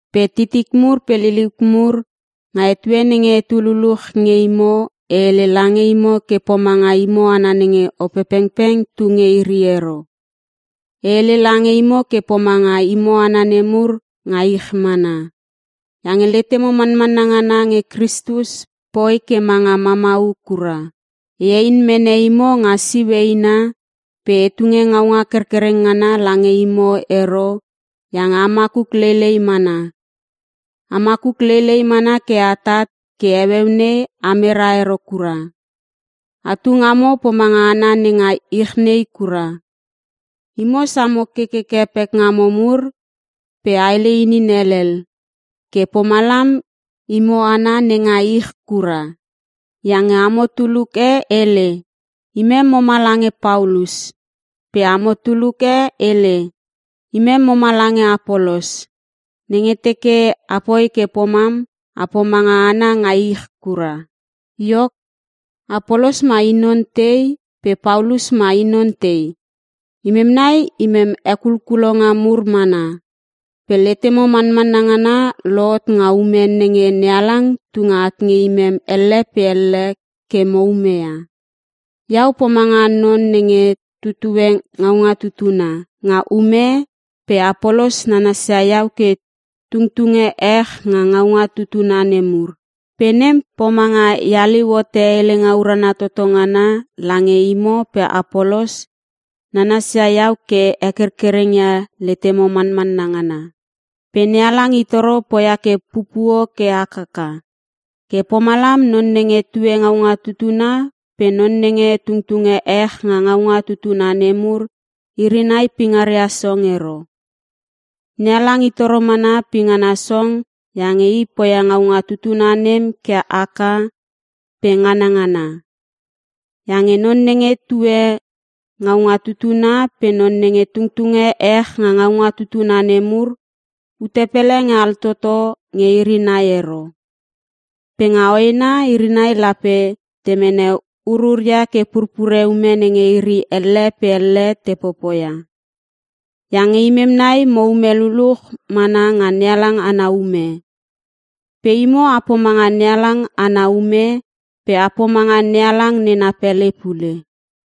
Pe titik mur pe liliuk mur, nga etue nenge etu luluch nge imo e hele lange imo ke pomanga imo hana nenge Opepengpeng tu nge iri ero. E hele lange imo ke pomanga imo hana nemur nga ich mana. Iange letemo manmanna ngana nge Kristus poi ke manga mamau kura. E hein mene imo nga siu eina pe e tunge ngaunga kerkererng ngana lange imo ero iange a makuk leilei mana. A makuk leilei mana ke atat, ke heueu nei amera ero kura. Atu ngamo pomanga hana nenga ich nei kura. Imo samo kekeke pekngamo mur pe a hele inin helel, ke pomalam imo hana nenga ich kura. Iange amo tuluk e hele, “Imem moma lange Paulus.” Pe amo tuluk e hele, “Imem moma lange Apolos.” Nenge teke apoi ke pomam a pomanga hana nga ich kura. Iok, Apolos mai i non tei pe Paulus mai i non tei? Imem nai imem hekulkulonga mur mana, pe letemo manmanna ngana lohot nga ume nenge NeHalang tunge at nge imem elle pe elle ke mo umeia. Iau pomanga non nenge tutue ngaunga tutuna nga ume pe Apolos nanasia iau ke tungtunge ech nga ngaunga tutuna nemur. Pe nem pomanga e haliu hote helenga urana toto ngana lange imo pe Apolos nanasia iau ke hekerkerengia letemo manmanna ngana. Pe NeHalang itoro poia ke pupuo ke hakaka. Ke pomalam non nenge tue ngaunga tutuna pe non nenge tungtunge ech nga ngaunga tutuna nemur iri nai pingaria song ero. NeHalang i toro mana pingana song iange I poia ngaunga tutuna nem ke haka pe nganangana. Iange non nenge tue ngaunga tutuna pe non nenge tungtunge ech nga ngaunga tutuna nemur, ute pele nge altoto nge iri nai ero. Pe nga hoena iri nai lape te mene ururia ke purpure ume nenge iri elle pe elle te popoia. Iange imem nai moume luluch mana nga NeHalang ana ume. Pe imo a pomanga NeHalang ana ume pe a pomanga NeHalang nena pele pule.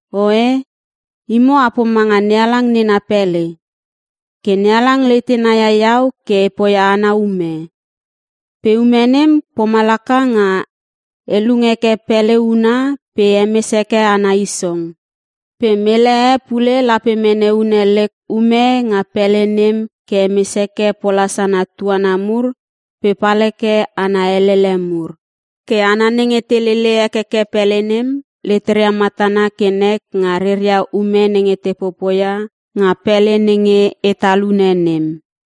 Oe, imo a pomanga NeHalang nena pele. Ke NeHalang letena ia iau ke e poia ana ume. Pe ume nem pomalaka nga e lung heke pele huna pe e hemes heke ana isong. Pe mele e pule lape mene une lek ume nga pele nem ke hemes heke pola sana tuana mur pe pal heke ana elele mur. Ke hana nenge te lele hekeke pele nem leteria matana ke nek nga reria ume nenge te popoia nga pele nenge e talune nem.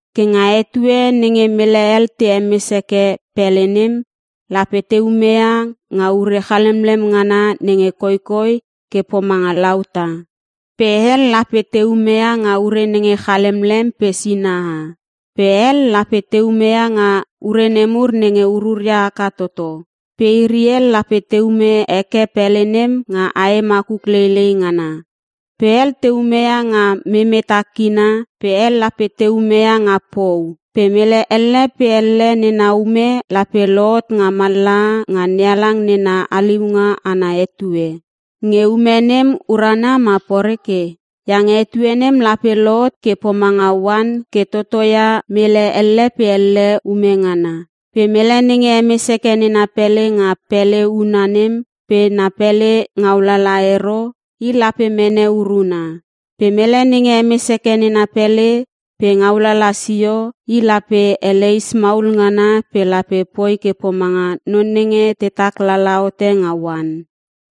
Ke nga etue nenge mele hel te hemes heke pele nem, lape te umeia nga ure chalemlem ngana nenge koikoi ke pomanga lauta. Pe hel lape te umeia nga ure nenge chalemlem pe sinaha, pe hel lape te umeia nga ure nemur nenge ururia haka toto. Pe iri hel lape te ume heke pele nem nga ae makuk leilei ngana. Pe hel te umeia nga memeta kina pe hel lape te umeia nga pou. Pe mele elle pe elle nena ume lape lohot nga mallaha nga NeHalang nena haliunga ana etue, nge ume nem urana ma poreke. Iange etue nem lape lohot ke pomanga oan ke totoia mele elle pe elle ume ngana. Pe mele nenge hemes heke nena pele nga pele huna nem pe na pele ngaulala ero, i lape mene uruna. Pe mele nenge hemes heke nena pele pe ngaulala sio, i lape eleis maul ngana pe lape poi ke pomanga non nenge tetak lala hote nga oan.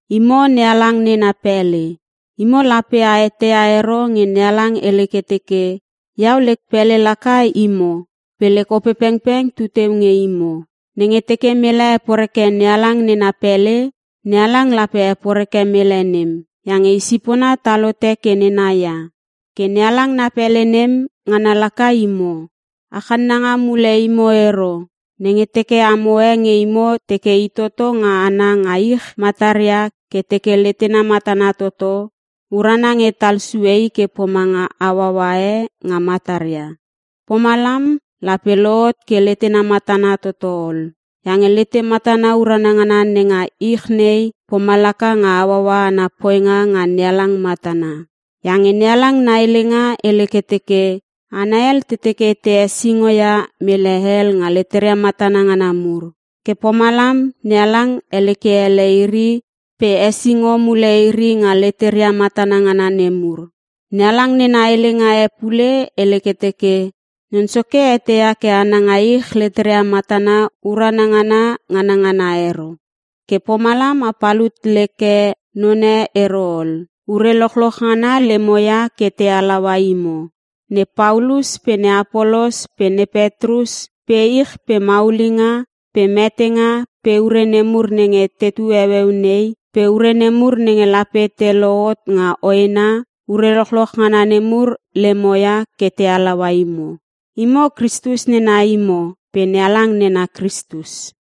Imo lape a eteia ero nge NeHalang hele ke teke, “Iau lek pele laka imo pe lek Opepengpeng tu teu nge imo.” Nenge teke mele heporeke NeHalang nena pele, NeHalang lape heporeke mele nem; iange i sipona tal hote ke nena ia. Ke NeHalang na pele nem, ngana laka imo. A channanga mule imo ero. Nenge teke amo e nge imo teke i toto nga hana nga ich mataria ke teke letena matana toto, urana nge tal sue i ke pomanga hauaua e nga mataria. Pomalam, lape lohot ke letena matana toto ol. Iange lete matana urana ngana nenga ich nei, pomalaka nga hauaua ana poinga nga NeHalang matana. Iange NeHalang na helenga hele ke teke, “Hana hel te teke te hesingo ia mele hel nga leteria matana ngana mur. Ke pomalam NeHalang helekleke ele iri pe hesingo mule iri nga leteria matana ngana nemur.” NeHalang nena helenga e pule hele ke teke, “Non Soke eteia ke hana nga ich leteria matana urana ngana nganangana ero.” Ke pomalam a palut leke none ero ol. Ure lochloch ngana lemo ia ke te halaua imo. Ne Paulus pe ne Apolos pe ne Petrus pe ich pe maulinga, pe metenga pe ure nemur nenge tetu heueu nei, pe ure nemur nenge lape te lohot nga hoena; ure lochloch ngana nemur lemoia ke te halaua imo. Imo, Kristus nena imo pe NeHalang nena Kristus.